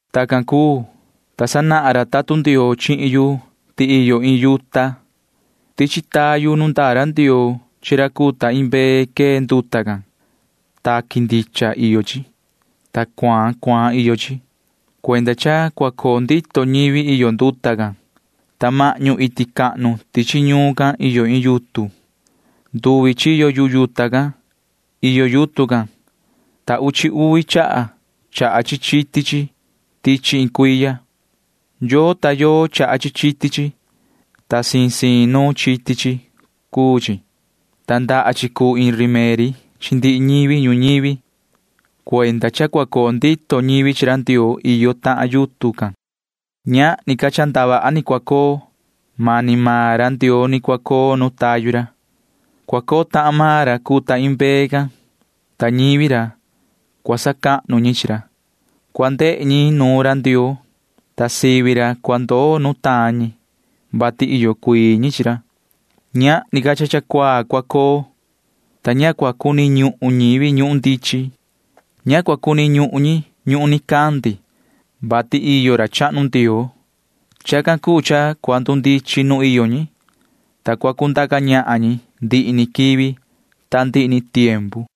Tacan cuu, ta sanahan ra tatun Ndioo chihin yu ti iyo iin yuta. Tichi tayu nu ndaa ra Ndioo chi ra cuu ta iin mbee quee nduta can. Taqui ndicha iyo chi, ta cuaan cuaan iyo chi. Cuenda cha cua coo ndito ñivi iyo nduta can, ta mahñu iti cahnu tichi ñuun can iyo iin yutun. Nduvi chiyo yu yuta can iyo yutun can, ta uchi uvi chaha chaha chi chiti chi tichi iin cuiya. Yoo ta yoo chaha chi chiti chi, ta siin siin nuun chiti chi cuu, ta ndaha chi cuu iin rimeri chi ndihi ñivi ñuñivi. Cuenda cha cua coo ndito ñivi chi ra Ndioo iyo tahan yutun can. Ñahni ca cha ndavaha ni cua coo. Mani maan ra Ndioo ni cua coo nu tayu ra. Cua coo tahan maan ra cuu ta iin mbee can, ta ñivi ra―cua sacahnu ñi chi ra. Cua ndehe ñi nuun ra Ndioo, ta sivi ra cua ndoo nutaan ñi, vati iyo cuii ñi chi ra. Ñahni ca cha cuaa cua coo, ta ña cua cuni ñuhun ñivi ñuhun ndichin. Ña cua cuni ñuhun ñi ñuhun nicandi, vati iyo ra chahnu Ndioo. Chacan cuu cha cua ndundichin nu iyo ñi, ta cua cundaca ñahan ñi ndihi ni quivi ta ndihi ni tiempu.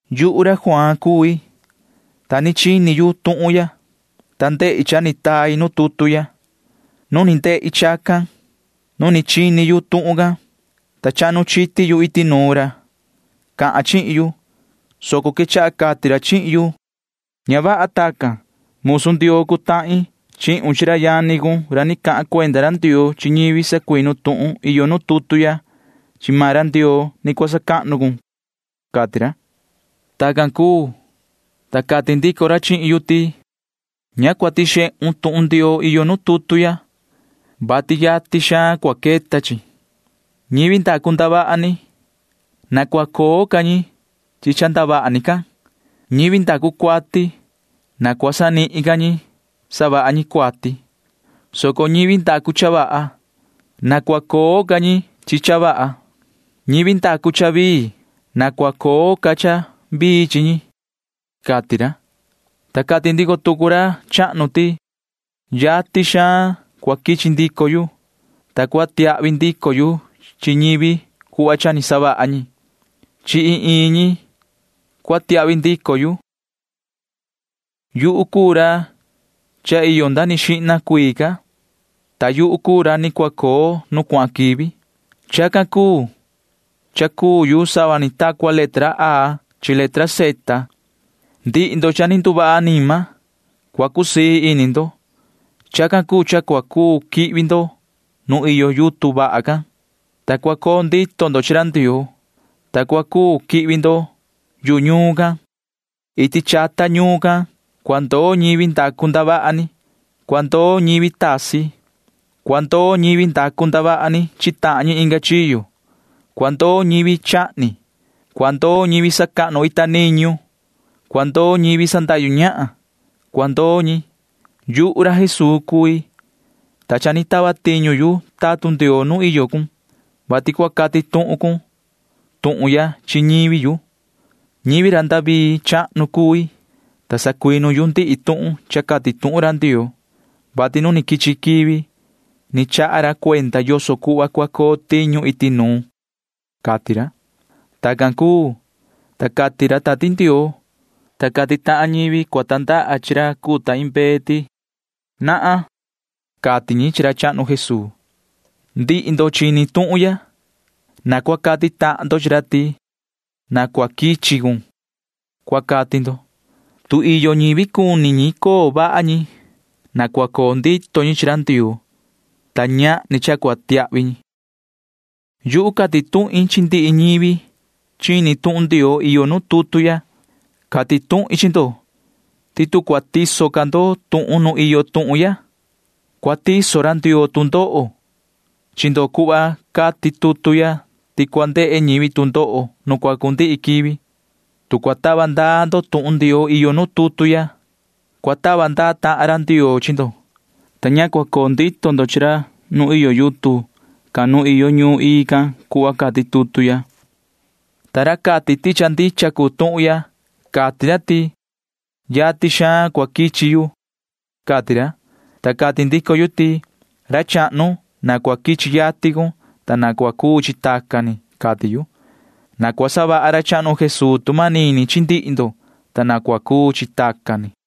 Yuhu ra Juaan cui, ta ni chini yu tuhun ya, ta ndehi cha ni tai nu tutu ya. Nu ni ndehi chacan, nu ni chini yu tuhun can, ta chahnu chiti yu iti nuun ra cahan chihin yu, soco quechaha cati ra chihin yu: ―Ña vaha chacan. Musu Ndioo cuu tahin chihun chi ra yani cun ra ni cahan cuenda ra Ndioo chi ñivi sacuinu tuhun iyo nu tutu ya. Chi maan ra Ndioo ni cua sacahnu cun ―cati ra. Tacan cuu, ta cati ndico ra chihin yu ti: ―Ña cua tixehun tuhun Ndioo iyo nu tutu ya, vati yatin xaan cua queta chi. Ñivi ndacu ndavaha ni―na cua coo ca ñi chi ndavaha ni can. Ñivi ndacu cuati―na cua sanihin ca ñi savaha ñi cuati, soco ñivi ndacu cha vaha―na cua coo ca ñi chi cha vaha. Ñivi ndacu cha vii―na cua coo ca cha vii chi ñi ―cati ra. [Ta cati ndico tucu ra chahnu ti:] ―Yatin xaan cua quichi ndico yu, ta cua tiahvi ndico yu chi ñivi cuhva cha ni savaha ñi. Chi iin iin ñi cua tiahvi ndico yu. Yuhu cuu ra cha iyo nda ni xihna cuii ca, ta yuhu cuu ra ni cua coo nu cuahan quivi. Chacan cuu cha cuu yu sava ni ta cua letra A chi letra Z ―cati ra. Ndihi ndo cha ni nduvaha anima―cua cusii ini ndo. Chacan cuu cha cua cuu quihvi ndo nu iyo yutun vaha can, ta cua coo ndito ndo chi ra Ndioo, ta cua cuu quihvi ndo yu ñuun can. Iti chata ñuun can cua ndoo ñivi ndacu ndavaha ni. Cua ndoo ñivi tasi. Cua ndoo ñivi ndacu ndavaha ni chi tahan ñi inga chiyo. Cua ndoo ñivi chahni. Cua ndoo ñivi sacahnu ita niñu. Cua ndoo ñivi sandahyu ñahan. Cua ndoo ñi. Ta cati ndico ra chahnu ti: ―Yuhu ra Jesuu cui, ta cha ni tava tiñu yu tatun Ndioo nu iyo cun, vati cua cati tuhun cun tuhun ya chi ñivi yu. Ñivi ra David chahnu cui, ta sacuinu yu ndihi tuhun cha cati tuhun ra Ndioo, vati nu quichi quivi ni chaha ra cuenda yoso cuhva cua coo tiñu iti nuun ―cati ra. Tacan cuu, ta cati ra Tati Ndioo, ta cati tahan ñivi cuu sava ta cua ña chanu ra cuu ta iin mbee ti: ―Na cua quichi cun ―cati ñi chi ra chahnu Jesuu. Ndihi ndo chini tuhun ya―na cua cati tahan ndo chi ra ti: ―Na cua quichi cun ―cua cati ndo. Tu iyo ñivi cuni ñi coo vaha ñi, na cua coo ndito ñi chi ra Ndioo, ta ñahni cha cua tiahvi ñi. Yuhu cati tuhin chi ndihi ñivi chini tuhun Ndioo iyo nu tutu ya. Cati tuhin chi ndo ti tu cua tiso ca ndo tuhun nu iyo tuhun ya, cua tiso ra Ndioo tu ndoho chi ndo cuhva cati tutu ya ti cua ndehe ñivi tu ndoho nu cua cundihi quivi. Tu cua tava ndaa ndo tuhun Ndioo iyo nu tutu ya, cua tava ndaa ra Ndioo chi ndo, ta ña cua coo ndito ndo chi ra nu iyo yutun can nu iyo ñuun ii can cuhva cati tutu ya. Ta ra cati ti cha ndicha cuu tuhun ya―cati ra ti: ―Yatin xaan cua quichi yu ―cati ra. Ta cati ndico yu ti: ―¡Yoho ra chahnu, na cua quichi yatin cun, ta na cua cuu chi tacan ni! ―cati yu. Na cua savaha ra chahnu Jesuu tu manini chi ndihi ndo, ta na cua cuu chi tacan ni.